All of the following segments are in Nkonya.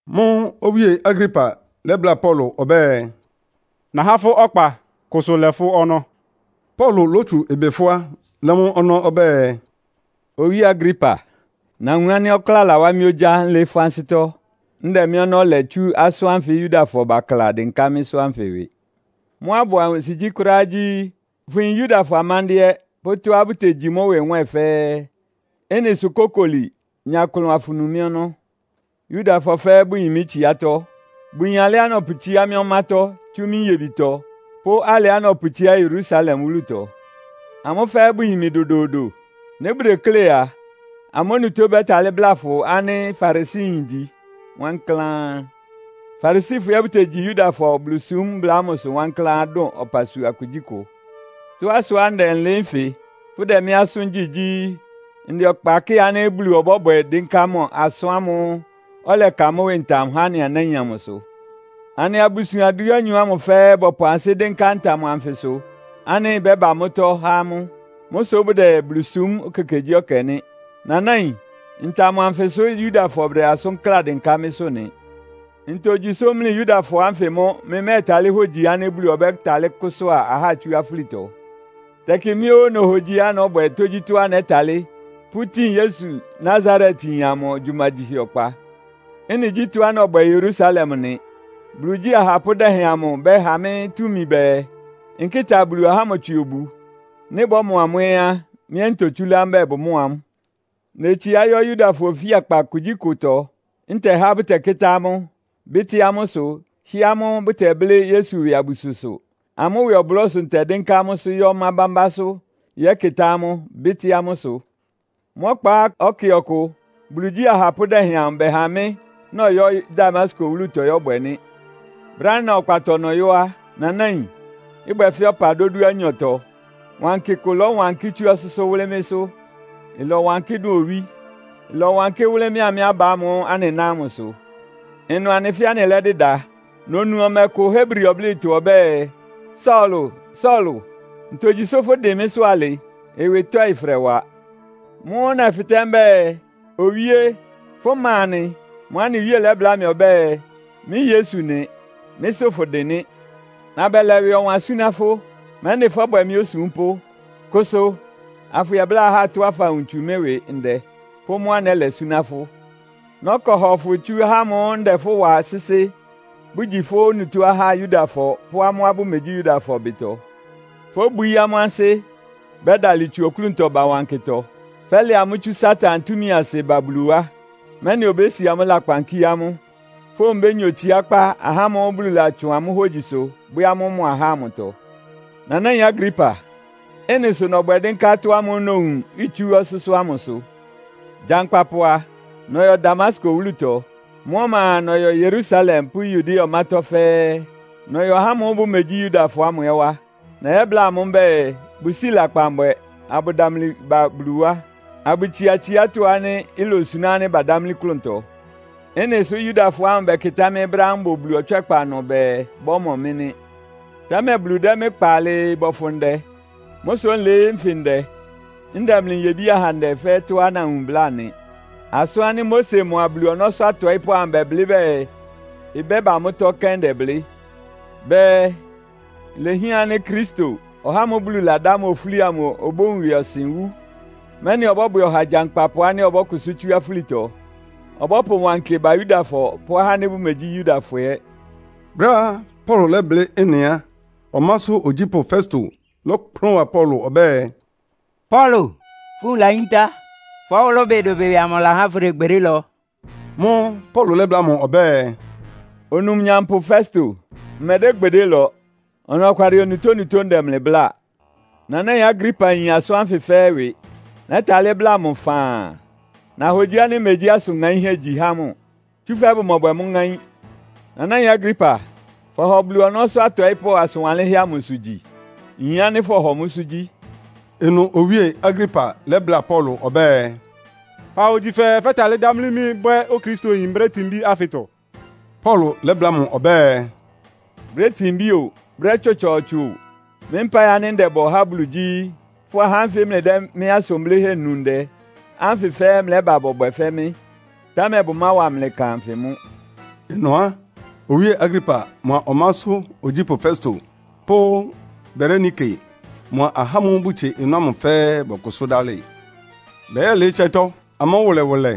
Mʋ́ʋ́ Owíe Agripa lɛ́bláa Paulo ɔbɛ́ɛ, “Nahá fʋ́ ɔkpa, kʋsʋ lɛ fʋ́ ɔnɔ́.” Paulo lótsu ɩbɩ fʋ́á, lɛ́ mʋ ɔnɔ́ ɔbɛ́ɛ, “Owíe Agripa, nawun ánɩ́ ɔkláa lawá mɩ́ ogyá nlɩɩ́ fʋ́ ansɩ́tɔ́, ndɛ mɩ́ ɔnɔ́ lɛ tsú asʋ́n ánfɩ Yudafɔ bakla dɩnká mɩ́sʋ́ anfɩ ɩwɩ. Mʋ́á ɩbʋ ansigyí kʋ́ráá gyí, fʋyin Yudafɔ amándɩ́ɛ́ pʋ́ tɔ́á bʋtegyi mʋ́ ɩwɩ nwɛ́ɛn fɛ́ɛ́. Ɩ́nɩ sʋ kókoli, nya klʋn afʋnu mɩ́ ɔnɔ́. “Yudafɔ fɛ́ɛ́ bʋyin mɩ́ tsiátɔ́. Bʋyin alɩá nɔpʋtsíá mɩ́ ɔmátɔ́ tsú mɩ́ nyebitɔ pʋ́ alɩá nɔpʋtsíá Yerusalem wúlutɔ. Amʋ́ fɛ́ɛ́ bʋyin mɩ dodoodo. Nɩ́ bʋdeklé a, amʋ́ onutó bɛ́talɩ́ bláa fʋ ánɩ́ Farisiyin ngyi wankláán. Farisifɔ ɛ́ bʋtegyi Yudafɔ Bulusúm mbla ámʋsʋ wankláán dʋn ɔpasua kugyíkʋ. Tɔ́á sʋá ndɛ nlɩɩ́ nfɩ, fʋdɛ mɩ́ asʋ́n gyí gyí, ndɛ ɔkpa kɩ́ɩ ánɩ́ Bulu ɔbɔ́bwɛ dɩ́nká mʋ asʋ́n ámʋ́ʋ́ ɔlɛka mʋ́ ɩwɩ ntam há anɩ anáin amʋsʋ. Anɩ abusuan dúanyɔ ámʋ fɛ́ɛ́ bɔpʋ ansɩ́ dɩ́nká ntam anfɩsʋ ánɩ́ ɩbɛ́ba mʋ́tɔ́ há amʋ́. Mʋ́ sʋ́ bʋdɛ Bulu súm ekekegyíɛkɛ nɩ́. Nanáin, ntam anfɩ sʋ́ Yudafɔ bʋdɛ asʋ́n kláa dɩnká mɩ́sʋ́ nɩ. Ntogyi sʋ́ mlɩ Yudafɔ ánfɩ mʋ́ mlɩmɛ́tálɩ́ hógyi ánɩ́ Bulu ɔbɛ́talɩ́ kʋ́sʋ́a ahá tsú afúlitɔ? “Tɛkɩ mɩ́ óó nohogyiá nɔ́bwɛ tógyítɔ́á nɛ́talɩ́ pʋ́tin Yesu Nasaretyin amʋ gyumagyihɛ ɔkpa. Ɩ́nɩ gyí tɔ́á nɔbwɛ Yerusalem nɩ. Bulu igyí ahapʋ́ dɛhɛn amʋ bɛha mɩ́ túmi bɛɛ, nkɩ́ta Bulu ahá ámʋ tswɩ obu. Nɩ́ bɔ́mɔ amʋ́ ɛ́ á, mɩ́ ɛ́ ntotsúlá mbɛ́ɛ bʋmɔ́ɔ amʋ́. Netsiá yɔ́ Yudafɔ ofíakpa kugyíkʋtɔ, ntɛhá bʋtɛkɩ́tá amʋ́, bɩ́tɩ́ amʋ́ ɩsʋ, hɩ́ɛ́ amʋ́ bʋtɛblɩ́ Yesu ɩwɩ abususʋ. Amʋ́ ɩwɩ ɔblɔ́ sʋ ntɛdɩ́nká amʋ́sʋ́ yɔ́ ɔmá bámbásʋ́ yɛ́kɩ́tá amʋ́, bɩ́tɩ́ amʋ́ ɩsʋ. “Mʋ́ ɔkpa ɛkɛ ɔkʋ Bulu igyí ahapʋ́ dɛhɛn amʋ bɛha mɩ́ nɔyɔ́ Damasko wúlutɔ yɔ́bwɛ nɩ́. Brɛ́á nna ɔkpatɔ nɔyɔ́ á, Nanáin, ɩbwɛ fɛ́ ɔpa dódúanyɔtɔ, wankɩ kʋ lɔ́wankɩ́ tsú ɔsʋ́sʋ́ wʋ́lɩ́ mɩ́sʋ́. Ɩlɔwankɩ́ dʋn owí. Ɩlɔwankɩ́ wʋ́lɩ́ mɩ́a mɩ́ aba ámʋ́ʋ́ anɩná ámʋsʋ. Ɩnʋ anɩ fɛ́ɛ́ anɩlɛ́dɩda. Nonu ɔmɛ kʋ Hebri ɔblɩ́tɔ ɔbɛ́ɛ, ‘Saulo, Saulo, ntogyi sʋ́ fʋ́dɩn mɩ́sʋ́ alɩ? Ɩwɩ tɔ́ɩ fʋdɛwa.’ Mʋ́ʋ́ nɛfɩtɛ́ mbɛ́ɛ, ‘Owíé, fʋ́ ma nɩ?’ Mʋ́ʋ́ anɩ Wíe lɛ́bláa mɩ ɔbɛ́ɛ, ‘Mɩ́ Yesu nɩ. Mɩ́sʋ́ fʋdɩn nɩ́. Nabɛlɛ ɩwɩ ɔwan súná fʋ́, mɛ́nɩ fɔ́bwɛ mɩ́ osúmpʋ́. Kʋsʋ, afʋyɛbláa ahá tɔ́á fawun tsu mɩ́ ɩwɩ ndɛ, pʋ́ mʋ́á nɛ́lɛ súná fʋ́. Nɔ́kɔ hɔ fʋ tsú ahá ámʋ́ʋ́ ndɛ fʋ́ wa sɩ́sɩ́, bʋgyi fʋ́ onutó ahá Yudafɔ pʋ́ amʋ́á bʋmegyí Yudafɔ ɩbɩtɔ. Fóbwií amʋ́ ansɩ́, bɛ́dalɩ tsu oklúntɔ ba wankɩtɔ. Fɛ́lɛ amʋ́ tsú Satan túmi asɩ ba Bulu wá, mɛ́nɩ obési amʋ́ lakpan kíé amʋ́, fówun bénya otsiákpá ahá ámʋ́ʋ́ Bulu latsʋn amʋ́ hógyisʋ bwɛ́ amʋ́ mʋ ahá amʋtɔ.’ “Nanáin Agripa, ɩ́nɩ sʋ nɔbwɛ dɩ́nká atɔ́ ámʋ́ʋ́ nowun itsú ɔsʋ́sʋ́ ámʋsʋ. Gyankpapʋ a, nɔyɔ Damasko wúlutɔ. Mʋ́ ɔma a, nɔyɔ Yerusalem pʋ́ Yudea ɔmátɔ́ fɛ́ɛ́. Nɔyɔ ahá ámʋ́ʋ́ bʋmegyí Yudafɔ ámʋ ɛ́ wá. Nɛyɛ́bláa amʋ́ mbɛ́ɛ, bʋsíi lakpan bwɛ, abʋdamli ba Bulu wá, abʋtsia tsiátɔ́ ánɩ́ ilosuná ánɩ́ badámlí klʋntɔ. Ɩ́nɩ sʋ́ Yudafɔ ámʋ bɛkɩtá mɩ́ brɛ́á mbʋ Bulu ɔtswɛ́kpa ɩnʋ bɛɛ bɔ́mɔ mɩ́ nɩ́. Támɛ Bulu dɛ́ mɩ́ kpa alɩɩ bɔfʋn ndɛ. Mʋ́ sʋ́ nlɩɩ́ nfɩ ndɛ, ndɛ mlɩ nyebí-ahandɛ fɛ́ɛ́ tɔ́á nawun bláa nɩ. Asʋ́n ánɩ́ Mose mʋa Bulu ɔnɔ́sʋ́ atɔɩ́pʋ́ amʋ bɛblɩ́ bɛɛ ɩbɛ́ba mʋ́tɔ́ kɛ́n ndɛblɩ́. Bɛɛ, ‘Ilehián ánɩ́ Kristo, (ɔhá ámʋ́ʋ́ Bulu ladá mʋ ofúli amʋ) obówun ɩwɩɔsɩn wú, mɛ́nɩ ɔbɔ́bwɛ ɔha gyankpapʋ ánɩ́ ɔbɔ́kʋsʋ́ tsú afúlitɔ. Ɔbɔ́pʋ wankɩ ba Yudafɔ pʋ́ ahá ánɩ́ bʋmegyí Yudafɔ ɛ́.’” Brɛ́á Paulo lɛ́blɩ́ ɩ́nɩ á, ɔmásʋ́ ogyípʋ́ Festo lɔ́kplʋn wa Paulo ɔbɛ́ɛ, “Paulo, fʋ́ nwun layíntá! Fʋ́ ɔwʋlʋ́bɩ dʋbɩdʋbɩ amʋ lahá fʋdɛ gbedé lɔ.” Mʋ́ʋ́ Paulo lɛ́bláa mʋ ɔbɛ́ɛ, “Onumnyampʋ Festo, mmɛdɛ́ gbedé lɔ. Ɔnɔkwalɩ onutónutó ndɛ mlɩ bláa. Nanáin Agripa yin asʋ́n ánfɩ fɛ́ɛ́ ɩwɩ. Nɛ́talɩ́ bláa mʋ faan. Nahogyi ánɩ́ megyí asʋn ŋaínhɛ́ igyi há mʋ, tsúfɛ́ bʋmɔbwɛ mʋ́ ŋáín. Nanáin Agripa, fɔhɔ Bulu ɔnɔ́sʋ́ atɔɩ́pʋ́ asʋn wanlɩ́nhɛ́ amʋsʋ gyi? Nyin ánɩ́ fɔhɔ mʋ́sʋ́ gyí.” Ɩnʋ Owíe Agripa lɛ́bláa Paulo ɔbɛ́ɛ, “Fahogyi fɛɛ fɛ́talɩ́ dámlí mɩ́ bwɛ́ Okristoyin brɛ́ tinbí ánfɩtɔ?” Paulo lɛ́bláa mʋ ɔbɛ́ɛ, “Brɛ́ tinbí o, brɛ́ tsɔtsɔɔtsɔ o, mɩ́ mpáɩ ánɩ́ ndɛbɔ há Bulu gyí, fʋ́a ahá ánfɩ mlɩdɛ́ mɩ́ asʋn blɩ́hɛ́ nu ndɛ ánfɩ fɛ́ɛ́ mlɛ́ba bɔbwɛ fɛ́ mɩ́. Támɛ bʋmáwa mlɩ ɩkan anfɩ mʋ́.” Ɩnʋ á, Owíe Agripa mʋa ɔmásʋ́ ogyípʋ́ Festo pʋ́ Berenike mʋa ahá ámʋ́ʋ́ bʋtsie ɩnʋ ámʋ fɛ́ɛ́ bɔkʋsʋ́ dálɩ. Bɛyɛ́lɩɩ́ ɩtsɛ́tɔ́, amʋ́ wʋlɛwʋlɛ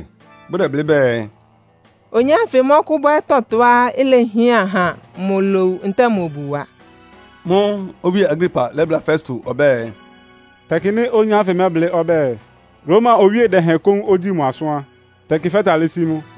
bʋdɛblɩ́ bɛɛ, “Oyin ánfɩ mɔ́kʋ́bwɛ́ tɔtɔá ilehián ha mʋ lowu ntɛ́ɛ mʋ obuwa.” Mʋ́ʋ́ Owíe Agripa lɛ́bláa Festo ɔbɛ́ɛ, “Tɛkɩ nɩ́ oyin ánfɩ mɛ́blɩ́ ɔbɛ́ɛ, Roma owíe dɛhɛn kóún ogyíi mʋ asʋ́n á, tɛkɩ fɛ́talɩ́ sí mʋ.”